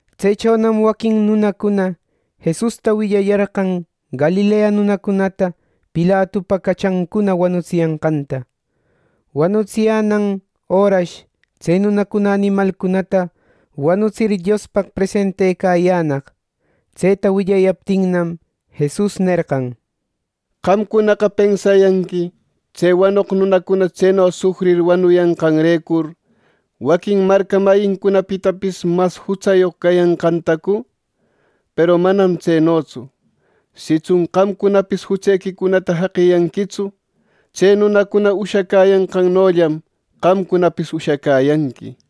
Tsechonam waquin nunacuna Jesusta willayarqan Galilea nunacunata Pilatupa cachancuna wanutsiyanqanta. Wanutsiyänan örash tse nunacuna animalcunata wanutsir Diospaq presentecayänaq. Tseta willayaptinnam, Jesus nerqan, “Qamcunaqa pensayanqui tse wanoq nunacuna tseno sufrir wanuyanqanrecur, ¿waquin marca mayincunapitapis mas jutsayoq cayanqantacu? Peru manam tsenotsu. Sitsun qamcunapis jutsequicunata jaqiyanquitsu, tse nunacuna ushacäyanqannollam, qamcunapis ushacäyanqui.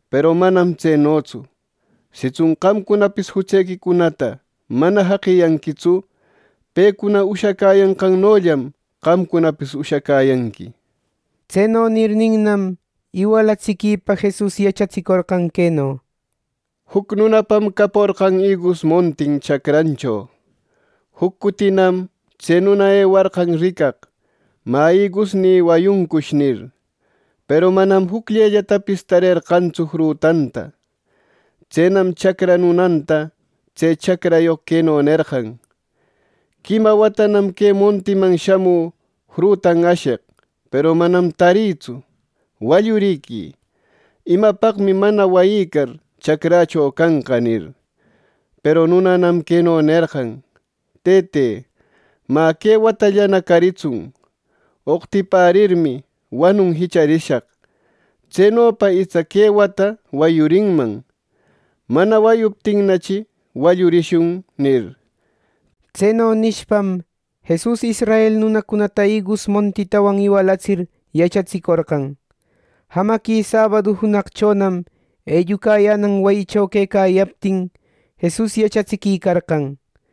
Peru manam tsenotsu. Sitsun qamcunapis jutsequicunata mana jaqiyanquitsu, pecuna ushacäyanqannollam, qamcunapis ushacäyanqui.” Tseno nirninnam, iwalatsiquipa Jesus yachatsicorqan queno: “Juc nunapam caporqan igus montin chacrancho. Juc cutinam tse nuna ewarqan ricaq ‘Mä, ¿igusnï wayuncush?’ nir, peru manam ni jucllellatapis tarerqantsu frutanta. Tsenam chacra nunanta tse chacrayoq queno nerqan: ‘Quima watanam que montïman shamü frutan asheq, peru manam tarïtsu. Wallurïquï. ¡Imapaqmi mana wayïcar chacrächo canqa!’ nir. Peru nunanam queno nerqan: ‘Tëte mä, que watallana caritsun. Oqtipärirmi, wanun jicharishaq. Tsenopa itsa que wata wayurinman. Mana wayuptinnachi, wallurishun’ nir.” Tseno nishpam, Jesus israel nunacunata igus montitawan iwalatsir, yachatsicorqan. Jamaqui sabadu junaqchonam, ellucayänan wayicho quecayaptin, Jesus yachatsiquicarqan.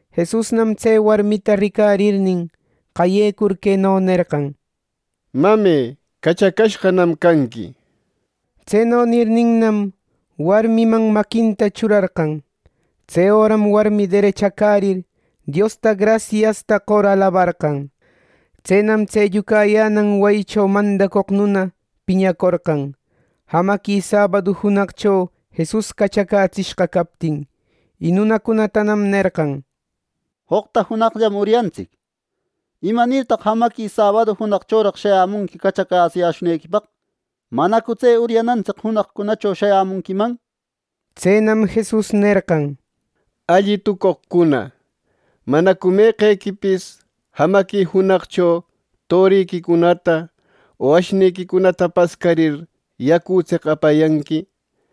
Jesusnam tse warmita ricarirnin, qayecur queno nerqan: —Mame, cachacashqanam canqui —nir. Tseno nirninnam, warmiman maquinta churarqan. Tse öram warmi derechacärir, Diosta grasiasta qor alabarqan. Tsenam tse ellucayänan wayicho mandacoq nuna piñacorqan, jamaqui sabadu junaqcho Jesus cachacätsishqa captin; y nunacunatanam nerqan: —Joqta junaqllam uryantsic. ¿Imanirtaq jamaqui sabadu junaqchoraq shayämunqui cachacätsiyäshunequipaq! ¿Manacu tse uryanantsic junaqcunacho shayämunquiman! —nir. Tsenam Jesus nerqan: —¡Alli tucoqcuna! ¿Manacu meqequipis jamaqui junaqcho toriquicunata o ashniquicunata pascarir, yacutseq apayanqui!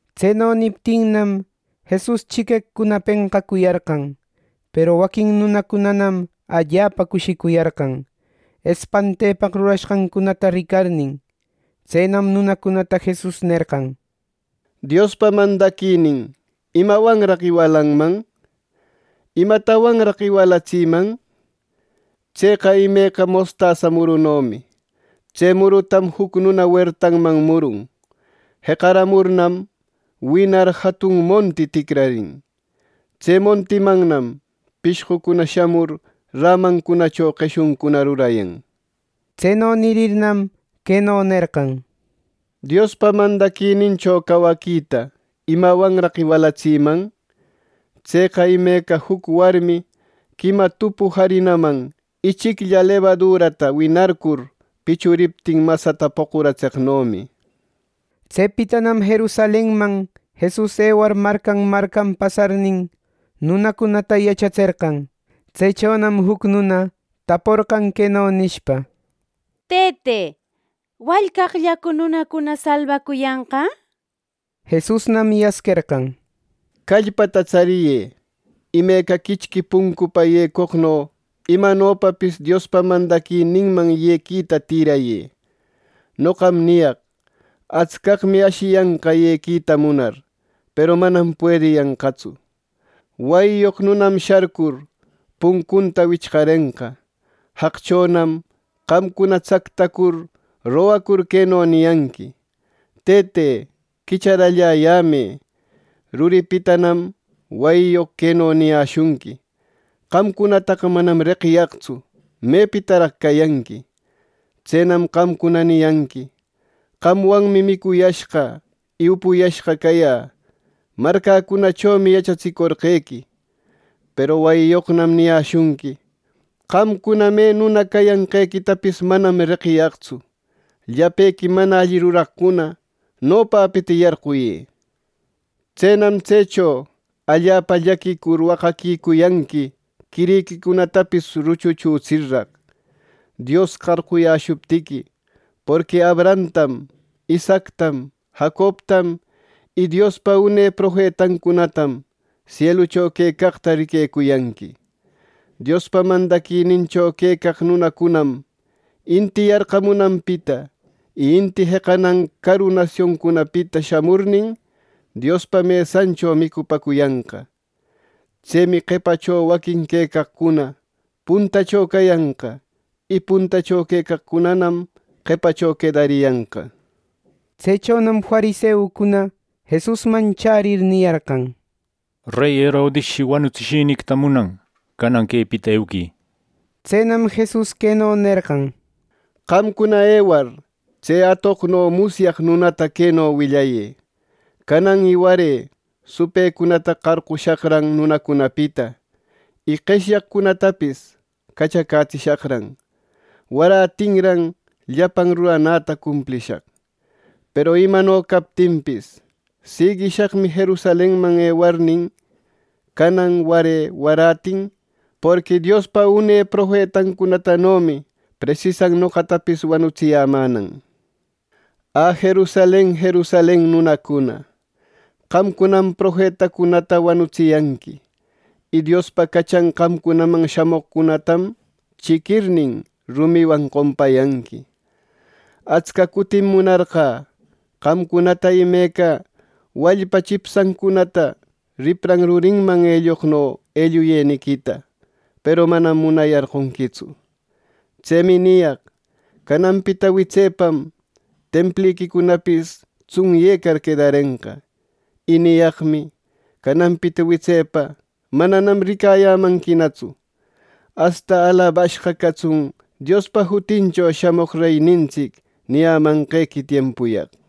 Tseno niptinnam, Jesus chiqueqcuna penqacuyarqan. Peru waquin nunacunanam allapa cushicuyarqan, espantepaq rurashqancunata ricarnin. Tsenam nunacunata Jesus nerqan, “Diospa mandaquinin, ¿imawanraq iwalanman? ¿Imatawanraq iwalatsïman? Tseqa imeca mostasa murunomi. Tse murutam juc nuna wertanman murun. Jeqaramurnam, winar jatun monti ticrarin. Tse montimannam pishqucuna shamur rämancunacho qeshuncuna rurayan.” Tseno nirirnam, queno nerqan: “Diospa mandaquinincho cawaquita ¿imawanraq iwalatsïman? Tseqa imeca juc warmi quima tupu jarinaman ichiclla lebadurata winarcur pichuriptin masata poqucaratseqnomi.” Tsepitanam Jerusalenman Jesus ewar marcan marcan pasarnin, nunacunata yachatserqan. Tsechonam juc nuna taporqan queno nishpa: —Tëte, ¿wallcaqllacu nunacuna salbacuyanqa? Jesusnam yasquerqan: —Callpata tsariyë. Imeca quichqui puncupa yecoqno imanopapis Diospa mandaquininman yequita tïrayë. Noqam niyaq: Atscaqmi ashiyanqa yequita munar, peru manam puediyanqatsu. Wayiyoq nunam sharcur puncunta wichqarenqa. Jaqchonam qamcuna tsactacur rogacur queno niyanqui: ‘Tëte, quicharalläyämë.’ Ruripitanam wayiyoq queno niyäshunqui: ‘¡Qamcunataqa manam reqiyaqtsu! ¿Mëpitaraq cayanqui!’ Tsenam qamcuna niyanqui: ‘Qamwanmi micuyashqa y upuyashqa cayä. Marcäcunachomi yachatsicorqequi.’ Peru wayiyoqnam niyäshunqui: ‘Qamcuna me nuna cayanqequitapis manam reqiyaqtsu. ¡Llapequi mana alli ruraqcuna, nopäpita yarquyë!’ nir. Tsenam tsecho allapa llaquicur waqaquicuyanqui quiriquicunatapis ruchuchutsirraq, Dios qarquyäshuptiqui, porqui Abrahamtam, Isaactam, Jacobtam, y Diospa une profetancunatam sielucho quecaqta riquecuyanqui. Diospa mandaquinincho quecaq nunacunam inti yarqamunanpita y inti jeqanan caru nasioncunapita shamurnin, Diospa mesancho micupäcuyanqa. Tsemi qepacho waquin quecaqcuna puntacho cayanqa, y puntacho quecaqcunanam qepacho quedariyanqa. Tsechonam fariseucuna Jesusman chärir, niyarqan: —Rey Herodisshi wanutsishiniquita munan. Canan quepita euquï. Tsenam Jesus queno nerqan: —Qamcuna ewar, tse atoqno musyaq nunata queno willayë: ‘Canan y ware supëcunata qarqushaqran nunacunapita y qeshyaqcunatapis cachacätsishaqran. Warätinran llapan ruranäta cumplishaq.’ Peru imano captinpis, siguishaqmi Jerusalenman ewarnin canan, ware, warätin; porqui Diospa une profetancunatanomi presisan noqatapis wanutsiyämänan. “¡Ä, Jerusalen, Jerusalen nunacuna! ¡Qamcunam profetacunata wanutsiyanqui y Diospa cachan qamcunaman shamoqcunatam chiquirnin, rumiwan qompayanqui! Atsca cutim munarqä qamcunata imeca wallpa chipshancunata ripran rurinman elloqno elluyeniquita; ¡Peru manam munayarqonquitsu! Tsemi niyaq: Cananpita witsepam Templiquicunapis tsunyecar quedarenqa. Y niyaqmi: Cananpita witsepa mananam ricayämanquinatsu asta ‘¡Alabashqa catsun Diospa jutincho shamoq reynintsic!’ niyamanqequi tiempuyaq.”